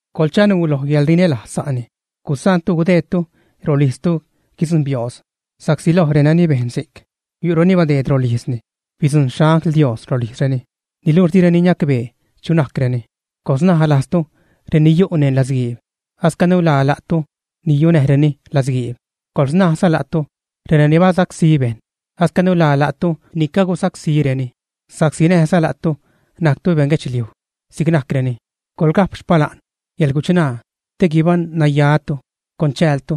Coḻchanuu lo yäḻrinälajz sa'ni. Di gusaantu gudeedtu rolijztu guidzujṉ biooz, sa'csi loj reni bejn si'c, yu'reni badeed rolijzreni bidzujṉ xangl Dios rolijzreni, niluxh direni niacbee chu najcreni. Coḻsnaj lajztu reni yu' neṉ latzguiib, ascanu la la'tu ni yunäreni latzguiib. Coḻsnajza lajztu renani basacsí bejṉ, ascanu la la'tu ni cagusacsíreni sa'csi näjza la'tu najctu beṉguedxliuj si'c najcreni. Coḻga'p xpala'n yäḻguchṉaa te guibaṉ-nayatu con chäältu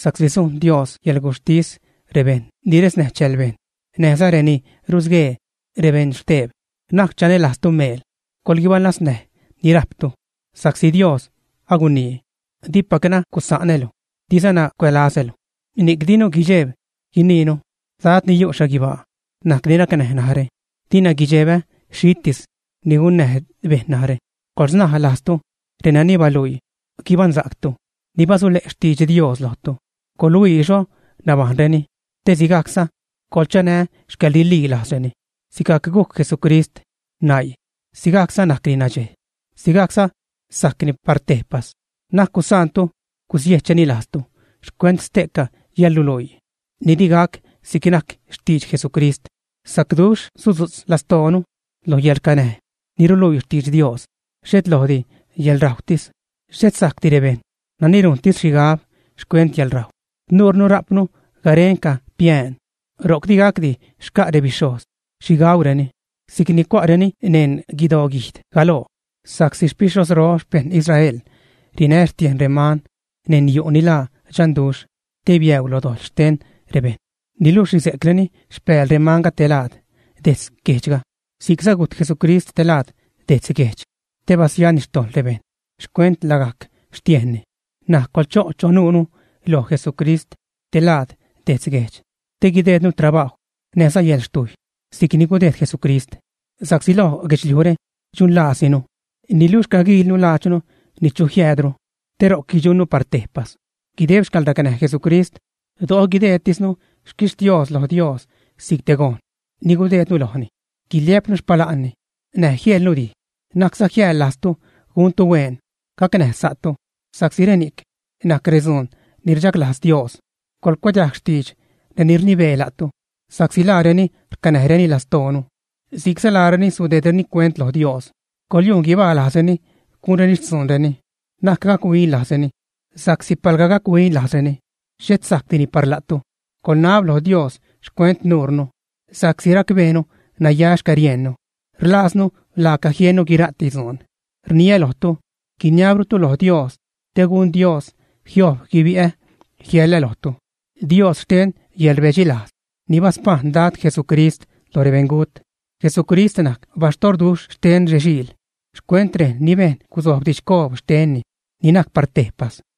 sa'csi sujn Dios yäḻguxhtis rebejṉ ni resnäj chääl bejṉ näjza reni rusguee rebeṉxteb. Na'c chanälajztu meel, coḻguibalaznäj ni rajptu, sa'csi Dios agunii: “Dipacna gusanälu, dizana cuälazälu.” Ni'c dinu guidxeeb guiniinu: Dad ni yu' xhaguibaa najc ni rcanäj narä; dina guidxebä xhitis ni gunnäj bejṉ narä. Coḻsnaj lajztu renani baluii guibaṉsa'ctu, ni basule'za xtidx Dios lojtu; coḻhuii xho nabajṉreni te sigajcza coḻchanä xcäḻrililajzreni. Sigajc gujc Jesucrist naii, sigajcza najcni nadxej, sigajcza sajcni par tejpas. Na'c gusaantu gusiejchreni lajztu xcuent ste'ca yäḻruluii ni digac si'c najc xtidx Jesucrist. Sacduxh sudzu'tz lastoonu lo yäḻracnäj ni ruluii xtidx Dios, xhet lojdi yäḻrajwtis. Xhet sajcdi rebejṉ nani rujntis xhigab xcuent yäḻrajw. Nuurnu rajpnu garenca piään, ro'c digacdi xca' rebixhojz xhi gaureni si'c ni cua'reni neṉ guidoguijd galoo. Sa'csi xpixhojzro xpejṉ Israel rinä xtiejn reman neṉ yu' ni laa dxanduxh te biäu lo dojḻ xten rebejṉ, niluxh rize'creni xpääl remanga te laad, dejtz guejdxga. Si'cza gujt Jesucrist te laad, dejtz guejdx, te basiani xtojḻ rebejṉ xcuent lagajc xtiejnni. N̲aj coḻcho' chonnu loj Jesucrist te laad dejtz guejdx te guideednu trabajw näjza yäḻxtujy si'cni gudejd Jesucrist. Sa'csi lo guedxliujre dxunlaasinu, niluxh caguiilnu laadxnu ni chu jiäädru, te ro'c guidxunnu par tejpas. Guideb xcäḻracnäj Jesucrist do'o guideedtisnu xquixtios lo Dios si'c te gojn ni gudeednu lojni, guiliä'pnu xpala'nni näj jieḻnu redij. Na'cza jiäḻlajztu guntu huen, gacnäj sa'tu, sa'csi reni'cni najc redzuun ni rdxaglajz Dios. Coḻcuadiajg xtidx reni rnibee la'tu, sa'csi laareni rcanäjreni lastoonu, si'cza laareni sudeedreni cuent lo Dios. Coḻyujn guibalajzreni gunreni xtzuunreni, na'c gac-huin lajzreni sa'csi palga gac-huin lajzreni, xhet sajcdini par la'tu. Coḻnab lo Dios xcuent nuunu, sa'csi racbeenu naya xcäriejnnu, rlaaznu laaca jiennu guira'ti dzuun. Rniä lojtu, guiniabrutu loj Dios, te gun Dios jiojb guibi'ä jiäḻä lojtu. Dios xten yäḻrbedxilajz ni baspajṉ Dad Jesucrist lo rebeṉgut, Jesucrist najc baxtorduxh xten rexiil xcuent rejn ni bejn gusojb didxcoob xtenni ni najc par tejpas.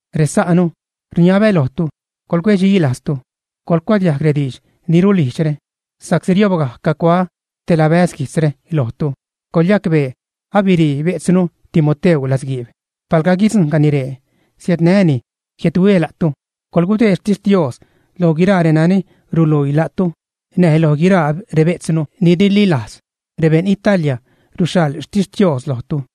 Resa'nu, rniabä lojtu, coḻcuecdxi lajztu, coḻcuadiajg rediidx ni rulijdxre, sa'csi riojbga cacuaä te labäz guijtzre lojtu. Coḻyacbee abirii bejtznu Timoteu latzguiib. Palga guidzuṉgajni ree, siädnää́ni jiädhuiä la'tu. Coḻgudeed xtixtios loj guiraa renani ruluii la'tu näj loj guiraa rebejtznu ni rililajz. Rebeṉ Italia ruxhaḻ xtixtios lojtu.